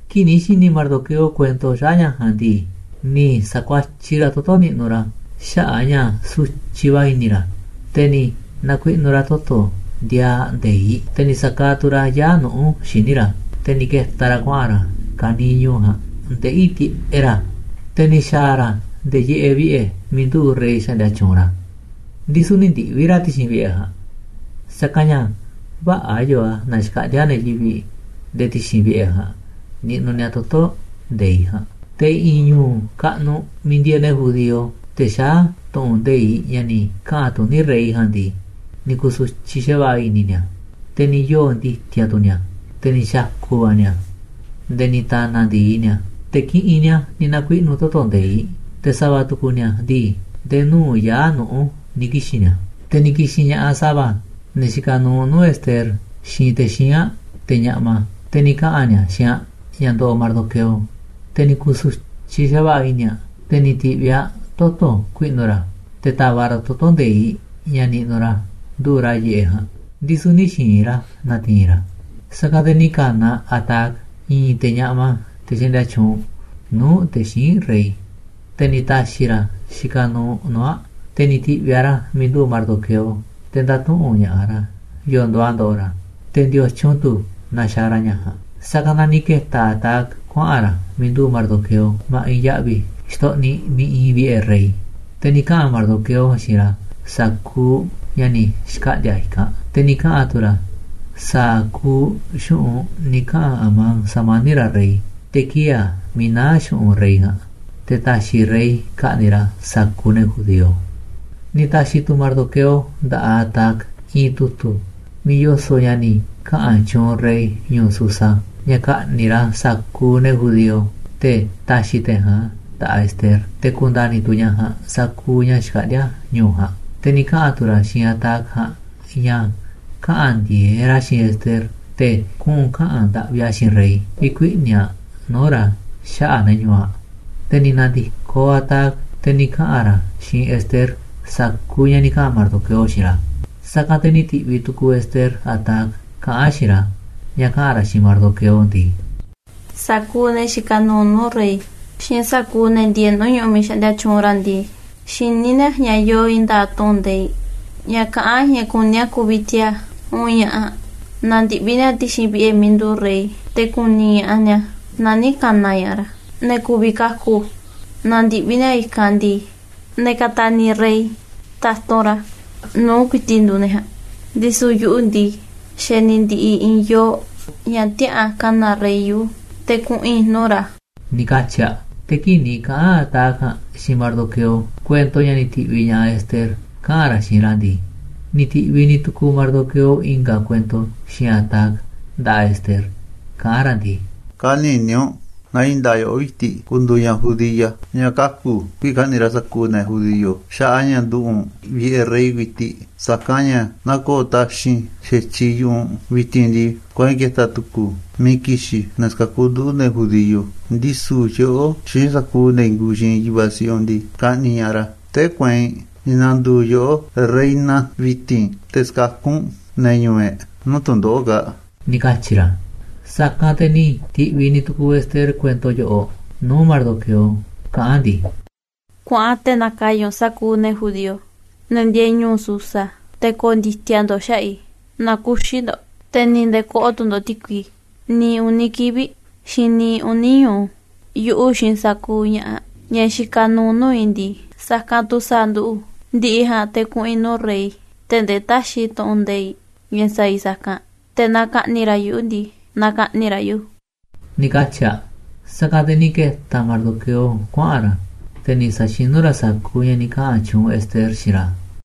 Kii̱ꞌ ni̱ xi̱ni̱ Mardoqueo kuento xaꞌa̱ꞌ ña̱ ja̱a̱nꞌ ndii, ni̱ sa̱kuatyiꞌ ra̱ toto̱ niꞌnuꞌ ra̱ xaꞌa̱ꞌ a̱ ña̱ sutyiꞌ va̱ i̱ni̱ ra̱. Te̱ ni̱ na̱kuiꞌnu̱ ra̱ toto̱ ndiaaꞌ nde̱iꞌ, te̱ ni̱ sa̱kaaꞌ tu̱ ra̱ yaa̱ꞌ nuꞌu̱ xíniꞌ ra̱. Te̱ ni̱ ke̱ta̱ ra̱ kuaꞌa̱n ra̱ ka̱niiꞌ ñu̱u̱ ja̱a̱nꞌ ndeꞌí tiꞌeꞌ ra̱. Te̱ ni̱ xa̱a̱ ra̱ nde̱e̱ yiꞌeꞌ vi̱ꞌe̱ miiꞌ nduꞌu̱ꞌ rey xaꞌndia tyuunꞌ ra̱, ndisu̱ nï̱ ndiꞌvi̱ ra̱ ti̱xi̱n vi̱ꞌe̱ ja̱a̱nꞌ, sa̱kanꞌ ña̱ vä̱ꞌa̱ yoo a̱ ña̱ xkaꞌndi̱a̱ ne̱ yivi̱ꞌ nde̱e̱ ti̱xi̱n vi̱ꞌe̱ ja̱a̱nꞌ niꞌnuꞌ ni̱a̱ toto̱ nde̱iꞌ ja̱a̱nꞌ. Te̱ i̱ꞌi̱n ñu̱u̱ kaꞌnuꞌ miiꞌ ndieeꞌ ne̱ judío, te̱ xaá tu̱ꞌu̱n nde̱iꞌ ña̱ ni̱ kaꞌa̱n tuní rey ja̱a̱nꞌ ndii, ni̱ ku̱su̱tyiꞌ xa̱va̱ꞌa̱ i̱ni̱ ni̱a̱, te̱ ni̱ yoo̱ ndi̱ti̱a̱ tu̱ ni̱a̱, te̱ ni̱ xa̱ku̱ va̱ ni̱a̱, nde̱e̱ ni̱ ta̱na̱ ndi̱i ni̱a̱, te̱ kiꞌinꞌ ni̱a̱ ni̱ na̱kuiꞌnu̱ toto̱ nde̱iꞌ. Te̱ sa̱va̱ tu̱ku̱ ni̱a̱ ndii, nde̱e̱ nuu̱ꞌ yaa̱ꞌ nuꞌu̱ ni̱ kixi̱n ni̱a̱. Te̱ ni̱ ki̱xi̱n ña̱ꞌaꞌ sa̱va̱, ne̱ xikaꞌ nuuꞌ nuu̱ꞌ Ester, xiinꞌ te̱ xíinꞌ aꞌ, te̱ ñaꞌma, te̱ ni̱ kaꞌa̱n ni̱a̱ xiinꞌ aꞌ ña̱ ndoꞌoꞌ Mardoqueo. Te̱ ni̱ ku̱su̱tyiꞌ xa̱va̱ꞌa̱ i̱ni̱ aꞌ. Te̱ ni̱ ti̱ꞌviꞌ aꞌ toto̱ ku̱i̱ꞌnu̱ ra̱, te̱ ta̱va̱ꞌ ra̱ toto̱ nde̱iꞌ ña̱ niꞌnuꞌ ra̱ nduꞌu̱ꞌ ra̱ yiꞌeꞌ ja̱a̱nꞌ, ndisu̱ nï̱ xi̱i̱n ra̱ na̱ti̱i̱n ra̱ a̱. Sa̱kanꞌ te̱ ni̱ ka̱na̱ aꞌ Hatac, i̱i̱n te̱ ñaꞌma, te̱ xaꞌndia tyuunꞌ nuu̱ꞌ te̱ xíinꞌ rey, te̱ ni̱ ta̱xi̱ ra̱ xikaꞌ nuuꞌ nuu̱ꞌ aꞌ. Te̱ ni̱ ti̱ꞌviꞌ aꞌ ra̱ miiꞌ nduꞌu̱ꞌ Mardoqueo te̱ nda̱tuꞌu̱nꞌ ña̱ꞌaꞌ ra̱ yo̱o̱ nduuꞌ a̱ ndoꞌoꞌ ra̱, te̱ ndiotyun tu̱ na xaaꞌ ra̱ ña̱ ja̱a̱nꞌ. Sa̱kanꞌ na ni̱ ke̱ta̱ Hatac kuaꞌa̱n ra̱ miiꞌ nduꞌu̱ꞌ Mardoqueo ma̱ꞌiꞌ ya̱ꞌvi̱ xtoꞌniꞌ miiꞌ iinꞌ vi̱ꞌe̱ rey. Te̱ ni̱ kaꞌa̱n Mardoqueo xiinꞌ ra̱ sa̱kuuꞌ ña̱ ni̱ xkaꞌndi̱a̱ i̱kanꞌ, te̱ ni̱ kaꞌa̱n tu̱ ra̱ sa̱a̱ kuuꞌ xu̱ꞌunꞌ ni̱ kaꞌa̱n Amán sa̱mani̱ꞌ ra̱ rey, te̱ kiee̱ a̱ miiꞌ naá xu̱ꞌunꞌ rey ja̱a̱nꞌ, te̱ ta̱xi̱ rey ka̱ꞌni̱ꞌ ra̱ sa̱kuuꞌ ne̱ judío. Ni̱ ta̱xi̱ tu̱ Mardoqueo nda̱ꞌaꞌ Hatac i̱i̱n tu̱tu̱ miiꞌ yoso̱ꞌ ña̱ ni̱ kaꞌa̱n tyuunꞌ rey ñu̱u̱ Susa, ña̱ ka̱ꞌni̱ꞌ ra̱ sa̱kuuꞌ ne̱ judío, te̱ ta̱xi̱ te̱ ja̱a̱nꞌ a̱ nda̱ꞌaꞌ Ester, te̱ ku̱nda̱ni̱ tu̱ ñaꞌ ja̱a̱nꞌ sa̱kuuꞌ ña̱ xkaꞌndíá ñu̱u̱ ja̱a̱nꞌ. Te̱ ni̱ kaꞌa̱n tu̱ ra̱ xiinꞌ Hatac ja̱a̱nꞌ ña̱ kaꞌa̱n ndi̱e̱eꞌ ra̱ xiinꞌ Ester te̱ kuꞌu̱n kaꞌa̱n ndaꞌvi aꞌ xiinꞌ rey vi̱kuiꞌni̱ aꞌ nuu̱ꞌ ra̱ xaꞌa̱ꞌ ne̱ ñu̱u̱ aꞌ. Te̱ ni̱ na̱ndi̱koꞌ Hatac, te̱ ni̱ kaꞌa̱n ra̱ xiinꞌ Ester sa̱kuuꞌ ña̱ ni̱ kaꞌa̱n Mardoqueo xiinꞌ ra̱. Sa̱kanꞌ te̱ ni̱ ti̱ꞌviꞌ tu̱ku̱u̱ Ester Hatac kaꞌán aꞌ xiinꞌ ra̱, ña̱ kaꞌa̱n ra̱ xiinꞌ Mardoqueo ndii: ―Sa̱kuuꞌ ne̱ xikaꞌ nuuꞌ nuu̱ꞌ rey, xiinꞌ sa̱kuuꞌ ne̱ ndieeꞌ nuu̱ꞌ ñu̱ꞌuꞌ miiꞌ xaꞌndia tyuunꞌ ra̱ ndii, xiní ni̱a̱ ña̱ yoo i̱i̱n nda̱a̱ꞌ tu̱ꞌu̱n nde̱iꞌ ña̱ kaꞌán ña̱ kuní a̱ ku̱vi̱ tiaa̱ uun ña̱ꞌaꞌ naaꞌ ndiꞌvi̱ ni̱a̱ ti̱xi̱n vi̱ꞌe̱ miiꞌ nduꞌu̱ꞌ rey, te̱ ku̱ni̱ ña̱ꞌaꞌ ni̱a̱ naaꞌ nï̱ ka̱na̱ ña̱ꞌaꞌ ra̱. Ne̱ ku̱vi̱ kaku̱ naaꞌ ndiꞌvi̱ ni̱a̱ i̱kanꞌ ndii, ne̱ ka̱ta̱ni̱ rey ta̱tunꞌ ra̱ nuu̱ꞌ ku̱i̱ti̱ꞌ nduuꞌ ne̱ ja̱a̱nꞌ. Ndisu̱ yuꞌu̱ ndii, xa̱ ni̱ ndi̱ꞌi̱ i̱i̱n yoo̱ꞌ ña̱ tiäꞌa̱an ka̱na̱ rey yuꞌu̱ te̱ kuꞌu̱n i̱ nuu̱ꞌ ra̱ ―ni̱ katyi̱ aꞌ. Te̱ kii̱ꞌ ni̱ kaꞌa̱n Hatac ja̱a̱nꞌ xiinꞌ Mardoqueo kuento ña̱ ni̱ ti̱ꞌviꞌ ña̱ꞌaꞌ Ester kaꞌa̱n ra̱ xiinꞌ ra̱ ndii, ni̱ ti̱ꞌviꞌ ni̱ tu̱ku̱u̱ Mardoqueo i̱nga̱ kuento xiinꞌ Hatac nda̱ꞌaꞌ Ester, kaꞌán ra̱ ndii: ―Kä̱ni̱ni̱ u̱nꞌ na i̱i̱n nda̱a̱ꞌ yoꞌó ku̱i̱ti̱ꞌ ku̱ndu̱u̱ ñaꞌ judía ñaꞌ kaku̱ kii̱ꞌ ka̱ꞌni̱ꞌ ra̱ sa̱kuuꞌ ne̱ judío xaꞌa̱ꞌ a̱ ña̱ nduꞌu̱ꞌ u̱nꞌ vi̱ꞌe̱ rey ku̱i̱ti̱ꞌ. Sa̱kanꞌ ña̱ naaꞌ ko̱o̱ taxi̱nꞌ xa̱tyiꞌ yu̱ꞌuꞌ u̱nꞌ vi̱ti̱n ndii, kueinꞌ ke̱ta̱ tu̱ku̱u̱ miiꞌ ki̱xi̱n ne̱ sa̱kakú nduꞌu̱, ne̱ judío. Ndisu̱ yoꞌó xiinꞌ sa̱kuuꞌ ne̱ i̱i̱n kuuꞌ xiinꞌ yu̱vaꞌ siꞌiꞌ u̱nꞌ ndii, ka̱ꞌni̱ꞌ ña̱ꞌaꞌ ra̱. Tee̱ꞌ kueinꞌ ni̱ na̱ndu̱u̱ yoꞌó reina vi̱ti̱n te̱ sa̱kakú u̱nꞌ ne̱ ñu̱u̱ e̱ꞌ nuu̱ꞌ tu̱ndoꞌo̱ꞌ kaa̱ꞌ ―ni̱ katyi̱ ra̱. Sa̱kanꞌ te̱ ni̱ ti̱ꞌviꞌ ni̱ tu̱ku̱u̱ Ester kuento yoꞌoꞌ nuu̱ꞌ Mardoqueo kaꞌán aꞌ ndii: ―Kuaꞌan te̱ na̱ka̱ya̱ u̱nꞌ sa̱kuuꞌ ne̱ judío, ne̱ ndieeꞌ ñu̱u̱ Susa, te̱ ko̱o̱ ndi̱ti̱a̱ ndo̱ꞌ xaꞌa̱ꞌ i̱, na kü̱xi̱ ndo̱ꞌ te̱ ni̱ nde̱e̱ kö̱ꞌo̱ tu̱ ndo̱ꞌ ti̱kui niiꞌ uni̱ kivi̱ꞌ, xiinꞌ niiꞌ uni̱ ñu̱u. Yuꞌu̱ xiinꞌ sa̱kuuꞌ ña̱ꞌaꞌ, ña̱ xikaꞌ nuuꞌ nuu̱ꞌ i̱ ndii, sa̱kanꞌ tu̱ sa̱a̱ nduꞌu̱. Ndi̱ꞌi̱ ja̱a̱nꞌ te̱ kuꞌu̱n i̱ nuu̱ꞌ rey tee̱ꞌ ndee täxiꞌ tu̱ꞌu̱n nde̱iꞌ ña̱ sa̱a̱ i̱ sa̱kanꞌ. Te̱ naaꞌ ka̱ꞌni̱ꞌ ra̱ yuꞌu̱ ndii, na ka̱ꞌni̱ꞌ ra̱ yuꞌu̱ ―ni̱ katyi̱ aꞌ. Sa̱kanꞌ te̱ ni̱ ke̱ta̱ Mardoqueo kuaꞌa̱n ra̱, te̱ ni̱ sa̱xinú ra̱ sa̱kuuꞌ ña̱ ni̱ kaꞌa̱n tyuunꞌ Ester xiinꞌ ra̱.